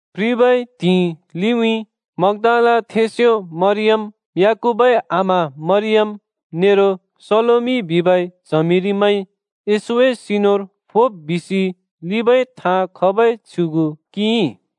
प्रिबै त्हिंइ लिउँइँ मग्‍दालाथेंस्‍यो मरियम, याकूबए आमा मरियम नेरो सलोमि बिबै च्हमिरिमैंइ येशूए सिनुर फोब् बिसि लिंबै थाँ खबै छ्युगु किंइ।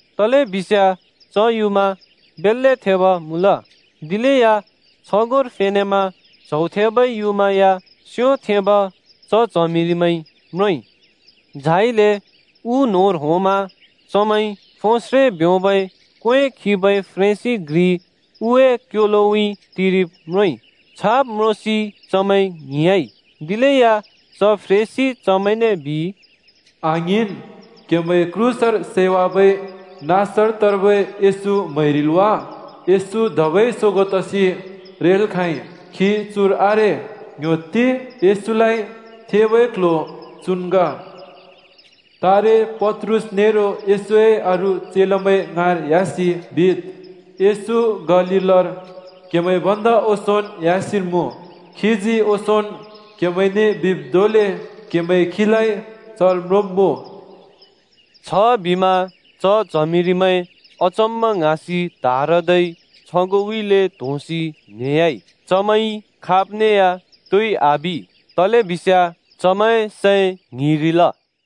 तलेबिस्याँ च युँमा बेल्‍ले थेब मुँल। दिलेया छगोंर फेनेमा च्हौ थेबै युँमा या स्योथेंब च च्हमिरिमैंइ म्रोंइ। झाइले उ न्‍होंर होंमा चमैंइ फोस्रे ब्योंबै क्‍वें खिबै फ्रेंसि घ्रि उए क्‍योलोउँइँ टिरिब् म्रोंइ। छाब् म्रोंसि चमैं ङ्हिंयाँइ। दिलेया च फ्रेंसिइ चमैंने बिइ, “आङ्हिंन्! क्‍हेमैंइ क्रूसर सैवाबै नासरतर्बै येशू म्‍हैरिल् वा? येशू धबै सोगों तसि रेल् खाँइ। खी चुर आरे। ङ्‌ह्‍योत्ति येशूलाइ थेंबै क्‍ल्‍ह्‍यो चुन् ग। तारे पत्रुस नेरो येशूए अरू चेलामैं ङाँर ह्‍यासि ‘येशू गालीलर क्हेमैं भन्दा ओंसोंन् ह्‍यासिन् मुँ। खीजी ओंसोंन् क्‍हेमैंने बिब् धोंले क्‍हेमैंइ खीलाइ चर म्रोंब्‍मुँ,’ बिसि बिद्।” छबिमा च च्हमिरिमैं अचम्‍म ङ्हाँसि त्हारदै छगोंउँइँले त्‍होंसि न्हेह्‍याइ। चमैंइ खाबने या तोइ आबि, तलेबिस्याँ चमैंए सैं ङ्हिंरिल।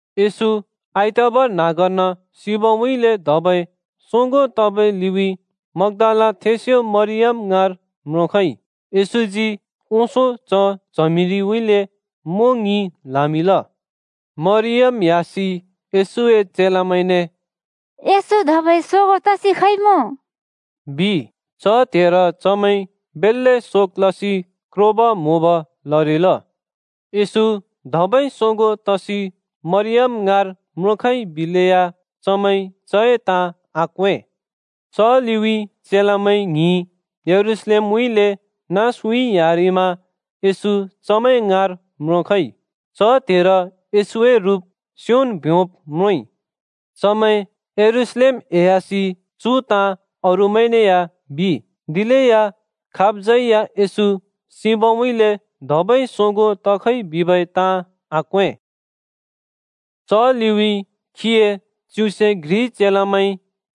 येशू आइतबार न्‍हाँगर्न सिबउँइँले धबै सोगों तबै लिउँइँ मग्‍दालाथेंस्‍यो मरियम ङाँर म्रोंखइ। येशूजी ओंसों च च्हमिरिउँइँले मों ङि ल्‍हामिंल। मरियम ह्‍यासि येशूए चेलामैंने “येशू धबै सोगों तसि खइमुँ” बिइ, च त्हेर चमैं बेल्‍ले शोक लसि क्रोब-म्‍होब लरिल। येशू धबै सोगों तसि मरियम ङाँर म्रोंखइ बिबै बिलेया, चमैंइ चए ताँ आक्वें। च लिउँइँ चेलामैं ङ्हिं यरूशलेमउँइँले नाँसउँइँ ह्‍यारिमा येशू चमैं ङाँर म्रोंखइ। च त्हेर येशूए रुप स्योन् ब्योंब् म्रोंइ। चमैं यरूशलेम एह्‍यासि चु ताँ अरूमैंने या बिइ, दिलेया खाबज्‍यै या येशू सिबउँइँले धबै सोगों तखइ बिबै ताँ आक्वें। च लिउँइँ खीए च्युसे घ्रि चेलामैं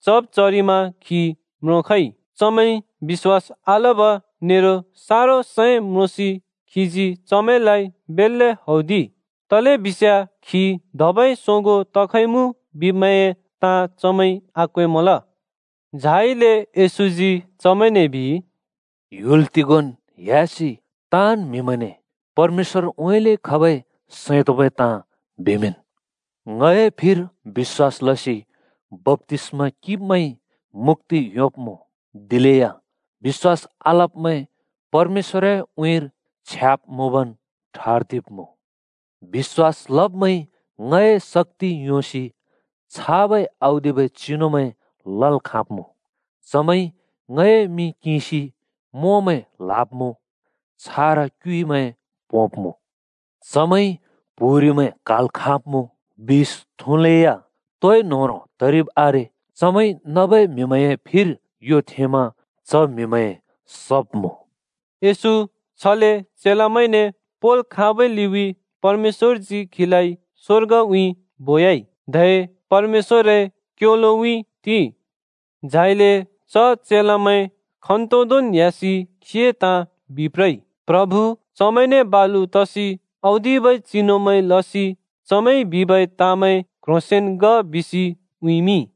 चब् चरिमा खी म्रोंखइ। चमैंइ बिश्‍वास आलब नेरो सारो सैं म्रोंसि खीजी चमैंलाइ बेल्‍ले हौदिइ। तलेबिस्याँ खी धबै सोगों तखइमुँ बिब्‍मैंए ताँ चमैंइ आक्वेंमल। झाइले येशूजी चमैंने बिइ, “ह्‍युल तिगोंन् ह्‍यासि ताँन् म्‍हिमैंने परमेश्‍वरउँइँले खबै सैं तोंबै ताँ बिमिंन्। ङए फिर बिश्‍वास लसि बप्‍तिस्‍मा किंब्मैंइ मुक्‍ति योंब्‍मुँ, दिलेया बिश्‍वास आलब्‍मैं परमेश्‍वरए उँइँर छ्याब् मुँबन् ठर्दिब्‍मुँ। बिश्‍वास लब्‍मैंइ ङए शक्‍ति योंसि छाबै औदिबै चिनुमैं लल् खाँब्मुँ: चमैंइ ङए मिं किंसि मोंमैं ल्‍हाब्‍मुँ, छारा क्युइमैं पोंब्‍मुँ। चमैंइ प्‍हुरिमैं क्‍हाल् खाँब्‍मुँ, बिष थुँलेया तोइ न्होह्रों तरिब् आरे, चमैंइ नबै म्‍हिमैंए फिर यो थेंमा च म्हिमैं सब्मुँ।” येशू छले चेलामैंने पोंल् खाँबै लिउँइँ परमेश्‍वरजी खीलाइ स्वर्गउँइँ बोयाइ, धै परमेश्‍वरए क्‍योलोउँइँ टिइ। झाइले च चेलामैं खन्‍तोदोंन् ह्‍यासि खीए ताँ बिप्रइ। प्रभु चमैंने बालु तसि औदिबै चिनुमैं लसि चमैंइ बिबै ताँमैं क्ह्रोंसेंन् ग बिसि उँइँमिंइ।